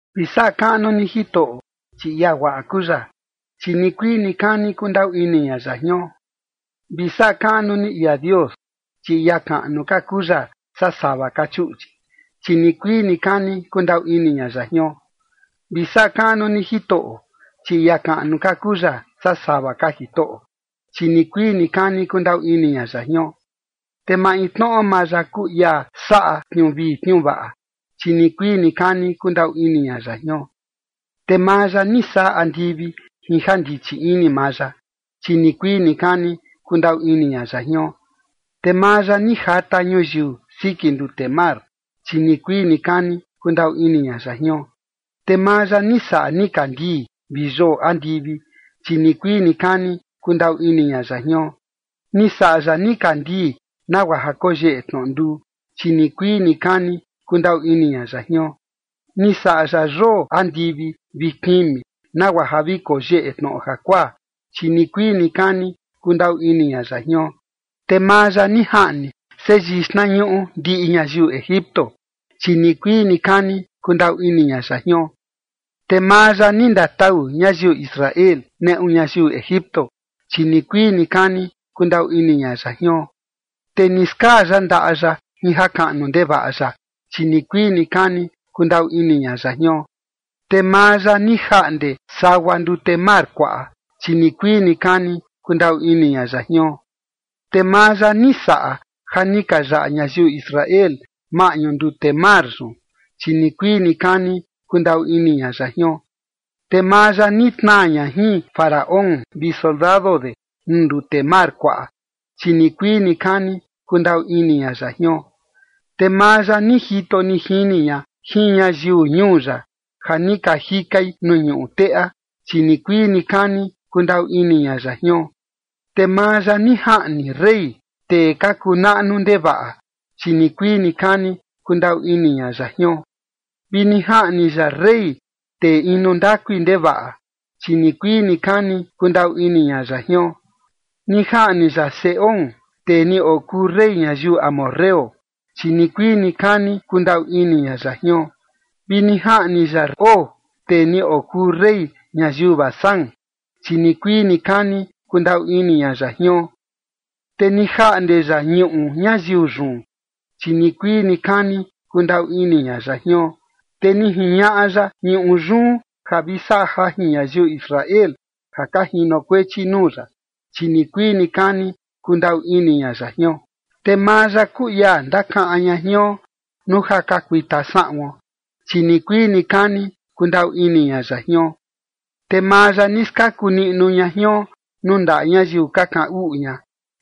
Vi saꞌa kaꞌnu ni Jitoꞌo, chi ia guaꞌa kuu ya, chi nikuii nikani kundaꞌu ini ña ya jion. Vi saꞌa kaꞌnu ni ia Dios, chi ia kaꞌnu ka kuu ya saa sava ka chuꞌchi, chi nikuii nikani kundaꞌu ini ña ya jion. Vi saꞌa kaꞌnu ni Jitoꞌo, chi ia kaꞌnu ka kuu ya saa sava ka jitoꞌo, chi nikuii nikani kundaꞌu ini ña ya jion. Te maintnoꞌo maa ya kuu ia saꞌa tniuu vii tniuu vaꞌa, chi nikuii nikani kundaꞌu ini ña ya jion. Te maa ya ni saꞌa andivi jin ja ndichi ini maa ya, chi nikuii nikani kundaꞌu ini ña ya jion. Te maa ya ni jata ñuyiu siki ndute mar, chi nikuii nikani kundaꞌu ini ña ya jion. Te maa ya ni saꞌa nikandii vi yoo andivi, chi nikuii nikani kundaꞌu ini ña ya jion. Ni saꞌa ya nikandii nagua ja koyeꞌe tnoꞌo nduu, chi nikuii nikani kundaꞌu ini ña ya jion. Ni saꞌa ya yoo andivi vi kimi nagua ja vi koyeꞌe tnoꞌo jakuaa, chi nikuii nikani kundaꞌu ini ña ya jion. Te maa ya ni jaꞌni seyii xtnañuꞌu ndiꞌi ñayiu Egipto, chi nikuii nikani kundaꞌu ini ña ya jion. Te maa ya ni ndatau ñayiu Israel, neꞌu ñayiu Egipto, chi nikuii nikani kundaꞌu ini ña ya jion. Te ni skaa ya ndaꞌa ya jin jakaꞌnu ndevaꞌa ya, chi nikuii nikani kundaꞌu ini ña ya jion. Te maa ya ni jaꞌnde sagua ndute mar kuaꞌa, chi nikuii nikani kundaꞌu ini ña ya jion. Te maa ya ni saꞌa ja ni ka yaꞌa ñayiu Israel maꞌñu ndute mar yun, chi nikuii nikani kundaꞌu ini ña ya jion. Te maa ya ni tnaa ña jin Faraón vi soldado de nuu ndute mar kuaꞌa, chi nikuii nikani kundaꞌu ini ña ya jion. Te maa ya ni jito ni jini ña jin ñayiu ñuu ya ja ni ka jikai nuu ñuꞌu teꞌa, chi nikuii nikani kundaꞌu ini ña ya jion. Te maa ya ni jaꞌni rey, tee ka kuu naꞌnu ndevaꞌa, chi nikuii nikani kundaꞌu ini ña ya jion. Vi ni jaꞌni ya rey, tee inu ndakui ndevaꞌa, chi nikuii nikani kundaꞌu ini ña ya jion. Ni jaꞌni ya Sehón, tee ni okuu rey ñayiu amorreo, chi nikuii nikani kundaꞌu ini ña ya jion. Vi ni jaꞌni ya Og, tee ni okuu rey ñayiu Basán, chi nikuii nikani kundaꞌu ini ña ya jion. Te ni jaꞌnde ya ñuꞌu ñayiu yun, chi nikuii nikani kundaꞌu ini ña ya jion. Te ni jiñaꞌa ya ñuꞌu yun ja vi saꞌa jajin ñayiu Israel ja ka jinokuechi nuu ya, chi nikuii nikani kundaꞌu ini ña ya jion. Te maa ya kuu ia ndakaꞌan ña jion nuu ja ka kuita saꞌuon, chi nikuii nikani kundaꞌu ini ña ya jion. Te maa ya ni skaku niꞌnu ña jion nuu ndaꞌa ñayiu ka kaꞌan uꞌu ña,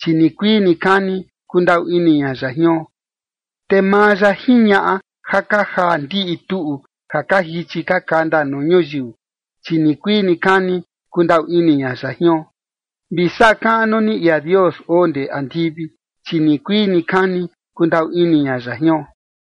chi nikuii nikani kundaꞌu ini ña ya jion. Te maa ya jiñaꞌa ja ka jaa ndiꞌi tuꞌu ja ka jichi ka kanda nuu ñuyiu, chi nikuii nikani kundaꞌu ini ña ya jion. Vi saꞌa kaꞌnu ni ia Dios oo ndee andivi, chi nikuii nikani kundaꞌu ini ña ya jion.